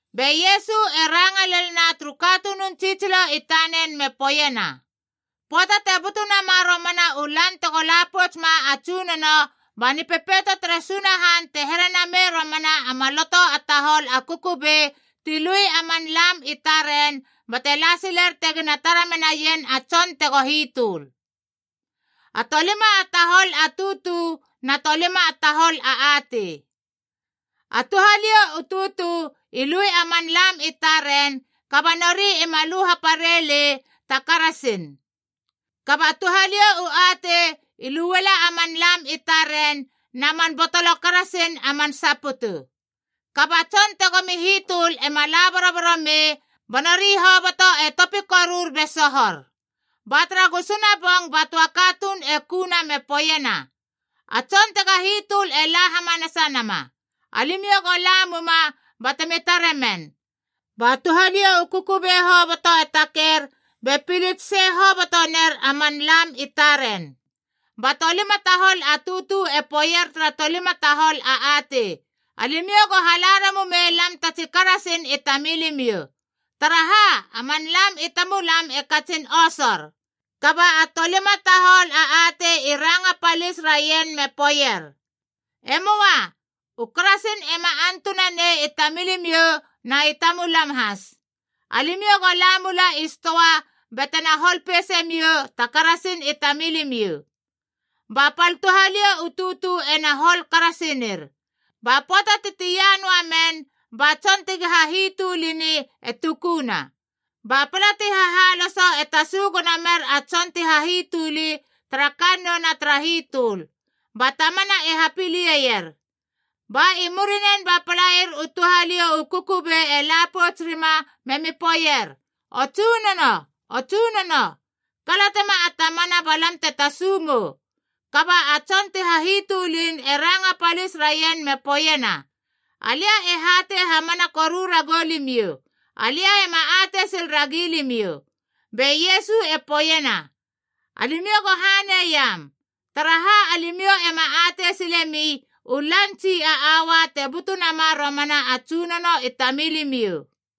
Be Iesu e ranga lelna turu katunun tsitsilo i tanen me poeiena, “Pöata te butu nama romana u lan tego la pouts ma a Tsunono, ba Nipepeito tere Sunahan te here namei romana a maloto a tahol a kukubei ti lui a man lam i taren bate la siler tegina tara menaien a tson tego hitöl. A tolima a tahol a tutu na tolima a tahol atei. A touhaliou u tutu i lui a man lam i taren, kaba nori ima lu hapare lei ta karasin. Kaba touhaliou u atei i luela a man lam i taren na man botolo karasin a man saputu. Kaba a tson tegomi hitöl ema la boroboro mei, ba nori hoboto e topi korur be sohor. “Ba tara gusuna bong ba töa katuun e kuna me poeiena, ‘A tson tega hitöl e la hamanasa nama. Alimiou go la muma batemi tare men.’ Ba touhaliou u kukubei hoboto e taker be pilits sei hobotoner a man lam i taren. Ba tolima tahol a tutu e poeier tara tolima tahol a atei, ‘Alimiou go hala ramumei lam ta tsi karasin i tamilimiou, taraha a man lam i tamulam e katsin osor.’ Kaba a tolima tahol a atei i ranga palis raien me poeier, ‘E möa. U karasin ema antunanei i tamilimiou na i tamulam has. Alimiou go la mula i stoa batena hol peise miou ta karasin i tamilimiou.’ “Ba pal touhaliou u tutu ena hol karasinir. Ba pöata ti tia noa men, ba tson tegi hahitölini e tukuna. Ba pala ti hahalosoa e tasu gono mer a tson ti hahitöli tara kannouna tara hitöl, ba tamana e hapilie ier. Ba i murinen ba palair u touhaliou u kukubei e la pouts rima memi poeier, ‘O Tsunono, o Tsunono, kalatema a tamana ba lam te tasu mou.’ Kaba a tson ti hahitölin e ranga palis raien me poeiena, ‘Alia e hatei hamana koru ragou limiou, alia ema atei sil ragi limiou.’” Be Iesu e poeiena, “Alimiou go haneiam, taraha alimiou ema atei silemi u lan tsi a aua te butu nama romana a Tsunono i tamilimiou.”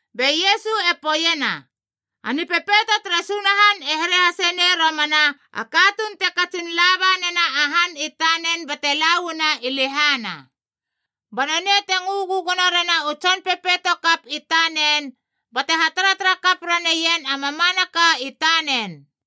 Be Iesu e poeiena, “A Nipepeito tere Sunahan e here hase nei romana a katuun te katsin laba nena a han i tanen bate lauana i lehana. Ba nonei te ngö gögono rena u tson pepeito kap i tanen bate hataratara kap raneien a mamanaka i tanen.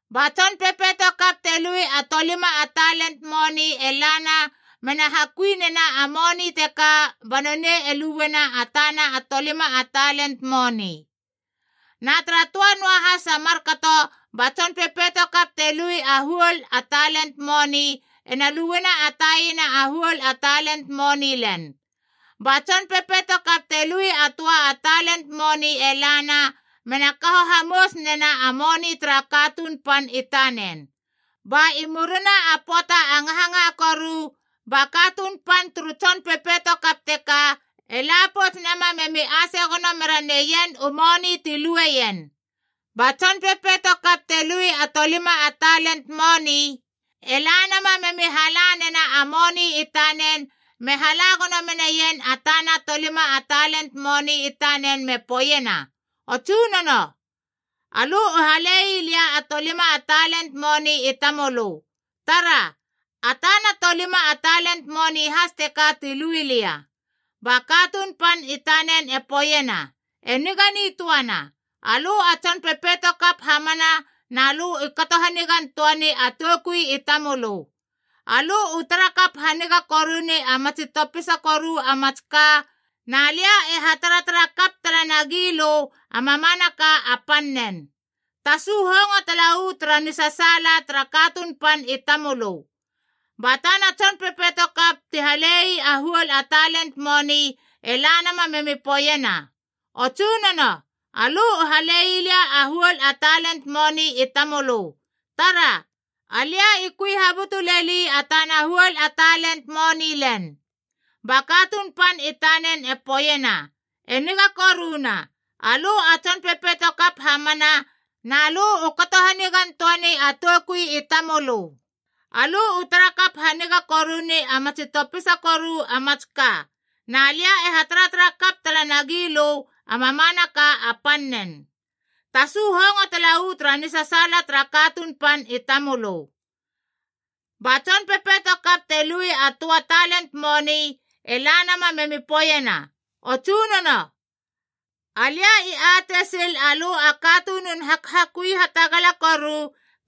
“Ba tson pepeito kap te lui a tolima a talen moni e lana mena hakui nena a moni teka ba nonei e luena a tana a tolima a talen moni. Na tara töa noahas a markato ba tson pepeito kap te lui a huol a talen moni ena luena a taina a huol a talen moni len. Ba tson pepeito kap te lui a töa a talen moni e lana, mena kaho hamous nena a moni tara katuun pan i tanen. “Ba i murina a pöata a ngahangaha koru, ba katuun pan turu tson pepeito kap teka e la pouts nama memi ase gono mera neien u moni ti lueien. Ba tson pepeito kap te lui a tolima a talen moni, e la nama memi hala nena a moni i tanen me hala gono meneien a tana a tolima a talen moni i tanen me poeiena, ‘O tsunono, alö u hale lei lia a tolima a talen moni i tamölö. Tara! A tana a tolima a talen moni has teka tu lui lia.’ Ba katuun pan i tanen e poeiena, ‘E niga nitöana, alö a tson pepeito kap hamana na lö u kato hanigan töani a toukui i tamölö. Alö u tara kap haniga koruni a matsi topisa koru a mats ka, na lia e ha taratara kap tala nagi lö a mamanaka a pannen. Tasu hongo tala uu tara nisasaala tara katuun pan i tamölö!’ “Ba tana tson pepeito kap ti halei a huol a talen moni e la nama memi poeiena, ‘O tsunono, alö u halei lia a huol a talen moni i tamölö. Tara! Alia i kui habutu leli a tana huol a talen moni len.’ Ba katuun pan i tanen e poeiena, ‘E niga koruna, alö a tson pepeito kap hamana na lö u kato hanigan töani a toukui i tamölö. Alö u tara kap haniga koruni a matsi topisa koru a mats ka, na lia e hataratara kap tala nagi lö a mamanaka a pannen. Tasu hongo tala uu tara nisasaala tara katuun pan i tamölö.’ “Ba tson pepeito kap te lui a töa a talen moni e la nama memi poeiena, ‘O tsunono, alia i atei sil alö a katunun hakhakui hatagala koru,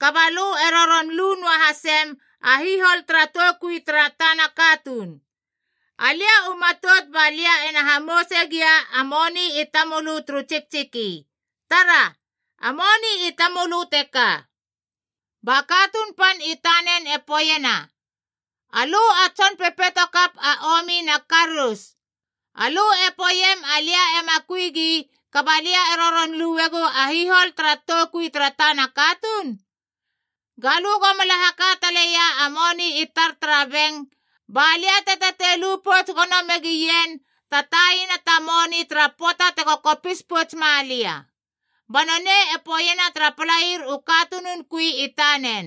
kaba lö e roron lu noa hasem a hihol tara toukui tara tana katuun. Alia u matout ba lia ena hamouse gia a moni i tamölö turu tsiktsiki. Tara! A moni i tamölö teka.’ Ba katuun pan i tanen e poeiena, ‘Alö a tson pepeito kap a omi na karous! Alö e poeiem alia ema kui gi kaba lia e roron luegou a hihol tara toukui tara tana katuun? Ga lö go mala haka taleia a moni i tar tara beng, ba lia te tatei lu pouts gono megien ta taina ta moni tara pöata tego kopis pouts malia.’ “Ba nonei e poeiena tara palair u katunun kui i tanen,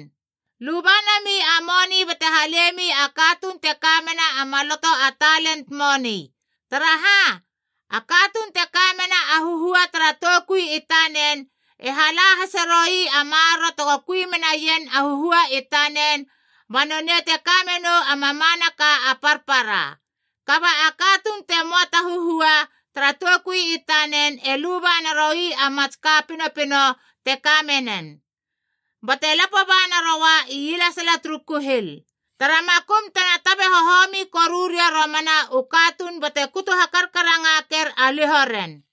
‘Luba nami a moni bate halemi a katuun te ka mena a maloto a talen moni. Taraha, a katuun te kamena a huhua tara toukui i tanen e hala hase roi a maroro tego kui menaien a huhua i tanen, ba nonei te kamenou a mamanaka a parpara. Kaba a katuun te möa ta huhua tara toukui i tanen e luba naroi a mats ka pinopino te ka menen. Bate lapo ba naroa ielesala turu kuhil. Tara makum tena tabe hohomi koru ria romana u katuun bate kutu hakarkarangaker a liho ren.’”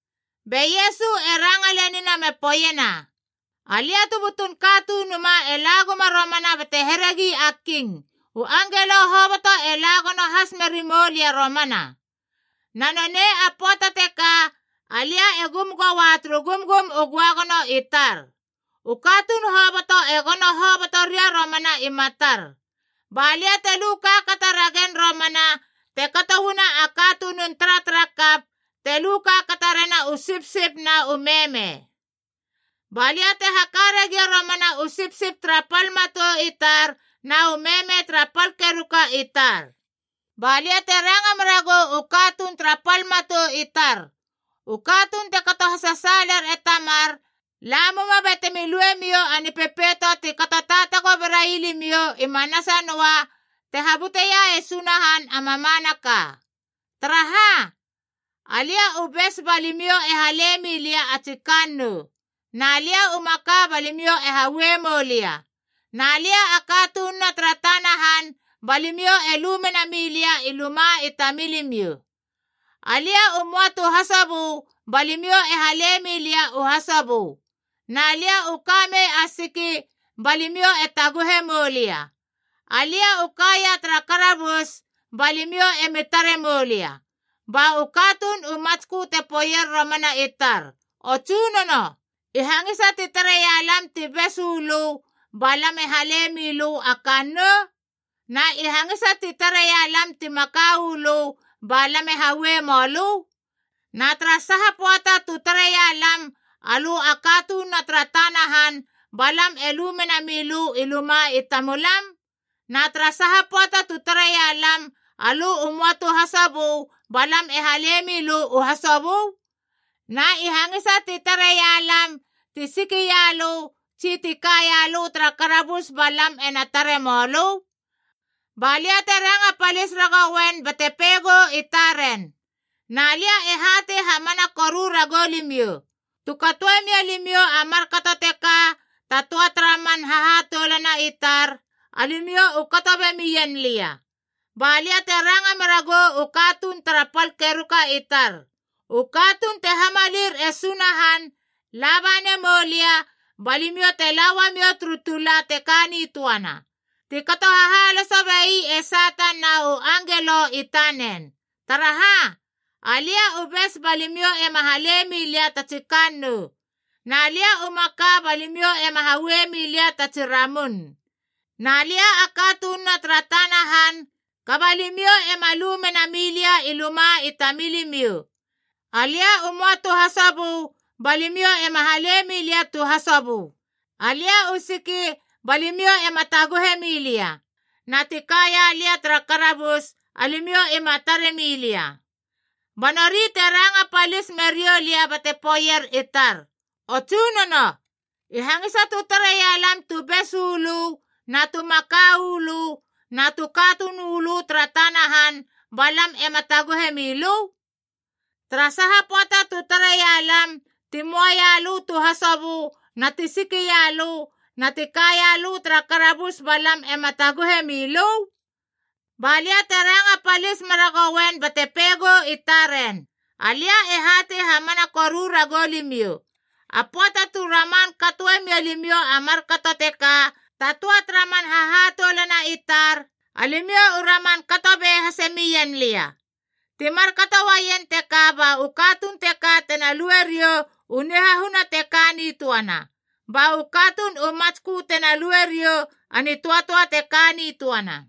Be Iesu e ranga lenina me poeiena, “Alia tu butun Katunuma e la guma romana bate heregi a king, u angelo hoboto e la gono has meri mou lia romana. Na nonei a pöata teka, alia e gum goa turu gumgum u göagono i tar. U katuun hoboto e gono hoboto ria romana i matar. Ba lia te lu kaakata ragen romana te kato uana a katunun taratarakap te lu kaakata rena u sipsip na u meme. Ba lia te haka ragia romana u sipsip tara pal matou i tar na u meme tara pal keruka i tar. “Ba lia te ranga meragou u katuun tara pal matou i tar, ‘U katuun te kato hasasaaler e Tamar, lamuma batemi luemiou a Nipepeito ti kato taatago berai limiou i manasa noa te habuteia e Sunahan a mamanaka. Taraha, alia u bes ba limiou e hale milia a tsi kannou. Na lia u maka ba limiou e haue moulia. Na lia a katununa tara tana han ba limiou e lu mena milia i luma i tamilimiou. Alia u möa tu hasobö ba limiou e hale mi lia u hasobö. Na lia u kamei a siki ba limiou e taguhe moulia. Alia u kaia tara karabus ba limiou emi tare moulia.’ “Ba u katuun u matskö te poeier romana i tar, ‘O Tsunono, i hangisa ti tareia lam ti bes uu lö ba lam e hale mi lö a kannou? Na i hangisa ti tareia lam ti maka u lö ba lam e haue mölö? Na tara saha pöata tu tareia lam alö a katununa tara tana han ba lam e lu mena milö i luma i tamulam? Na tara saha pöata tu tareia lam alö i möa tu hasobö ba lam e hale mi lö u hasobö? Na i hangisa ti tareia lam ti siki ialö tsi ti kaia lö tara karabus ba lam ena tare mölö?’ “Ba lia te ranga palis ragouen bate peigou i taren, ‘Na lia e hatei hamana koru ragou limiou, tu katoe mia limiou a markato teka ta töa tara man hahatoulana i tar, alimiou u kato be mien lia.’ “Ba lia te ranga meragou u katuun tara pal keruka i tar, ‘U katuun te hamalir e Sunahan, laba nemou lia ba limiou te la uamiou turu tula te ka nitöana, ti kato hahaloso bei e Satan na u angelo i tanen. Taraha, alia u bes ba limiou ema hale milia ta tsi kannou. Na lia u maka ba limiou ema haue milia ta tsi ramun. Na lia a katununa tara tana han, kaba limiou ema lu mena milia i luma i tamilimiou. Alia u möa tu hasobö ba limiou ema hale milia tu hasobö. Alia u siki ba limiou ema taguhe milia, na ti kaia lia tara karabus, alimiou ima tare milia.’ “Ba nori te ranga palis meriou lia bate poeier i tar, ‘O Tsunono, i hangisa tu tareia lam tu bes uu lö na tu maka uu lö na tu katuun uu lö tara tana han ba lam ema taguhe mi lö? Tara saha pöata tu tareia lam ti möa ialö tu hasobö na ti siki ialö na ti kaia lö tara karabus ba lam ema taguhe mi lö?’ Ba lia te ranga palis meragouen bate peigou i taren, ‘Alia e hatei hamana koru ragou limiou, a pöata tu raman katoe mia limiou a markato teka ta töa tara man hahatoulana i tar, alimiou u raman kato be hase mien lia.’ Ti markato uaien teka ba u katuun teka tena lue riou u nihahuna te ka nitöana, ba u katuun u matskö tena lue riou a nitöatöa te ka nitöana.”